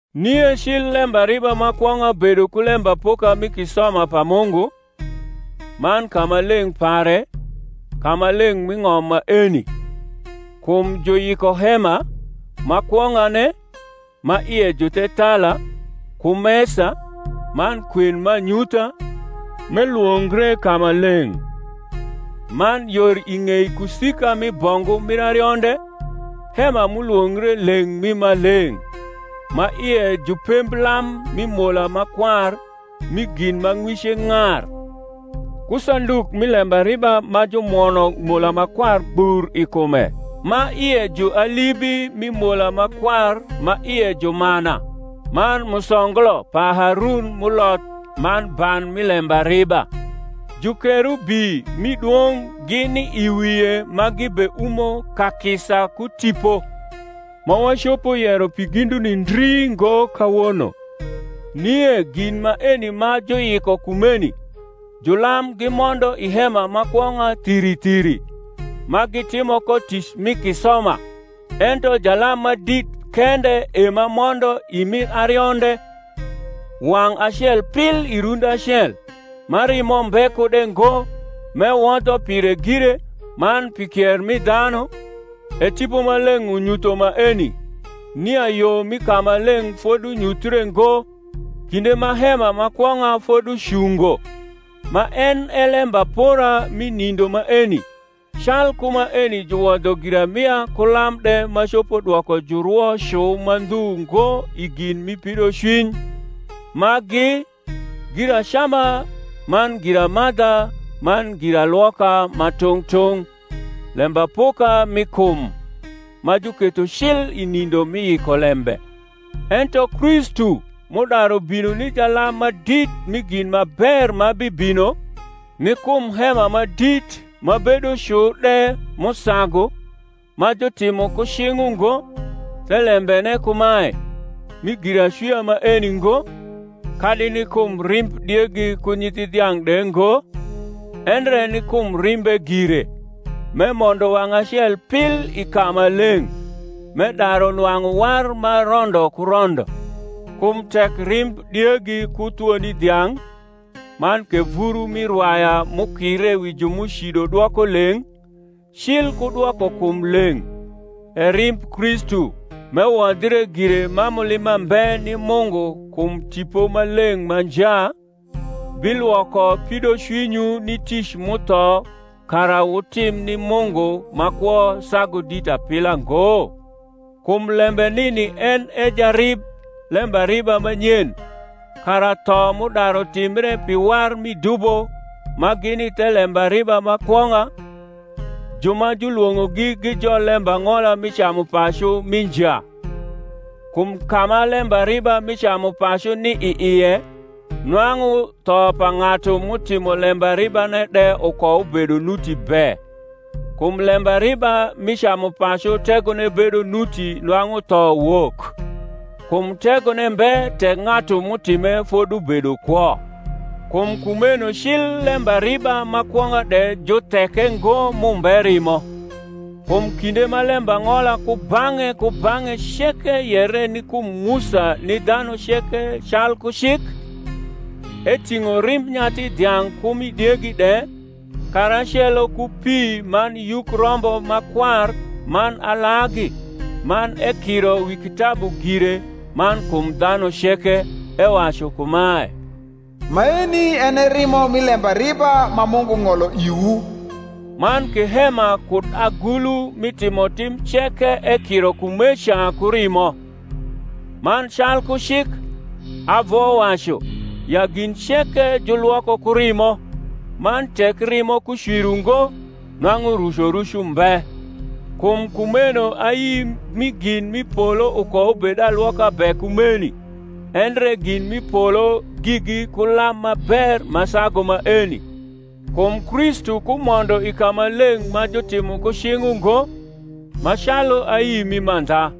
Nie cil lembariba ma kwong’a bedo ku lembapoka mi kisoma pa Mungu, man kamaleng’ pare, kamaleng’ m’i ng’om maeni. Kum juyiko hema, ma kwong’ane, ma ie ju thethala, ku mesa, man kwen m’anyutha; m’elwongre Kamaleng’. Man yor i ng’ei kusika mi bongu mir arionde, hema m’ulwongre Leng’ mi Maleng’; ma ie ju pemblam mi mola ma kwar rni gin ma ng’wice ng’ar, ku sanduk mi lembariba ma jumwono mola ma kwar gbur i kume ma ie ju alibi mi mola ma kwar ma ie ju mana, man musonglo pa Harun m’uloth, man ban mi lembariba; jukerubi mi dwong’ gini i wie ma gibeumo kakisa ku tipo; ma wacopo yero pi ginduni ndri ngo kawono. Nie gin maeni ma juyiko kumeni, julam gimondo i hema ma kwong’a thiri thiri, ma gitimo ko tic mi kisoma; ento jalam ma dit kende e ma mondo i mir arionde, wang’ acel pil i rundi acel, ma rimo mbe kude ngo, m’ewodho pire gire, man pi kier mi dhanu, e Tipo Maleng’ unyutho maeni, nia yo mi kamaleng’ fodunyuthie ngo, kinde ma hema ma kwong’a foducungo; ma en e lembapora mi nindo maeni; calku maeni juwodho giramia ku lam de ma copo dwoko jurwo cu ma ndhu ngo i gin mi pidocwiny, ma gi, (giracama man giramadha man giralwoka ma tung’ tung’) lembapoka mi kum, ma juketho cil i nindo mi yikolembe. Ento Kristu m’udaru bino ni jalam ma dit mi gin ma ber ma bibino, ni kum hema ma dit ma bedo cu de m’usagu, ma jutimo ku cing’ ungo, thelembene kumae, mi giracwia maeni ngo, kadi ni kum rimb diegi ku nyithi dhiang’ de ngo, endre ni kum rimbe gire, m’emondo wang’ acel pil i kamaleng’, m’edaru nwang’u war ma rondo ku rondo. Kum tek rimb diegi ku thwoni dhiang’, man ke vuru rni rwaya m’ukire wi ju m’ucido dwoko leng’, cil ku dwoko kum leng’: e rimb Kristu, m’ewodhre gire ma mulima mbe ni Mungu kum Tipo Maleng’ ma nja, bilwoko pidocwinywu ni tic m’utho kara wutim ni Mungu ma kwo sagu dit apila ngo? Kum lembe nini en e jarib lembariba ma nyen, kara tho m’udaru timbre pi war mi dubo ma gini the lembariba ma kwong’a, ju ma julwong’ogi gijol lembang’ola mi camupacu mi nja. Kum ka ma lembariba mi camupacu ni i ie, nwang’u tho pa ng’atu m’utimo lembaribane de ukoubedo nuti be. Kum lembariba mi camupacu tegone bedo nuti nwang’u tho wok: kum tegone mbe tek ng’atu m’utime fodubedo kwo. Kum kumeno cil lembariba ma kwong’a de jutheke ngo m’umbe rimo. Kum kinde ma lembang’ola kubang’e kubang’e ceke yere ni kum Musa ni dhanu ceke calku cik, eting’o rimb nyathi dhiang’ ku mi diegi de, karacelo ku pi man yuk rombo ma kwar man alagi, man ekiro wi kitabu gire man kum dhanu ceke, ewacu kumae, Maeni en e rimo mi lembariba ma Mungu ng’olo iwu. Man ke hema kud agulu mi timotim ceke ekiro kumeca ku rimo. Man calku cik, avowacu, ya gin ceke julwoko ku rimo, man tek rimo ku cwir ungo, nwang’u rucoruc umbe. Kum kumeno ayi mi gin m’i polo ukoubed alwoka be ku maeni; endre gin m’i polo gigi ku lam ma ber ma sagu maeni. Kum Kristu kumondo i kamaleng’ ma jutimo ku cing’ ungo, ma calu ayi mi mandha;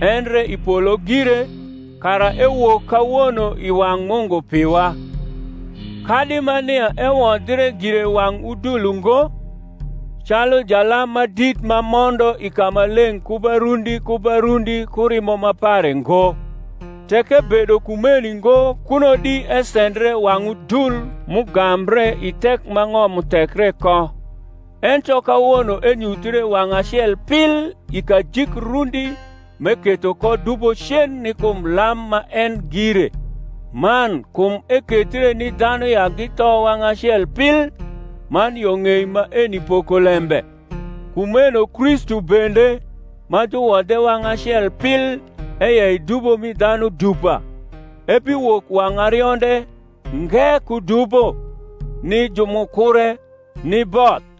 endre i polo gire, kara ewok kawono i wang’ Mungu piwa: kadi ma nia ewodhie gire wang’ udul ungo, calu jalam ma dit ma mondo i kamaleng’ ku ba rundi ku ba rundi ku rimo ma pare ngo: tek ebedo kumeni ngo kuno di esendre wang’ udul m’ugambre i thek ma ng’om uthekre ko: ento kawono enyuthre wang’ acel pil i kajik rundi m’eketho ko dubo cen ni kum lam ma en gire. Man kum ekethre ni dhanu ya githo wang’ acel pil, man yo ng’ei maeni pokolembe; kumeno Kristu bende, ma juwodhe wang’ acel pil eyei dubo mi dhanu dupa, ebiwok wang’ arionde, nge ku dubo, ni ju m’ukure, ni both.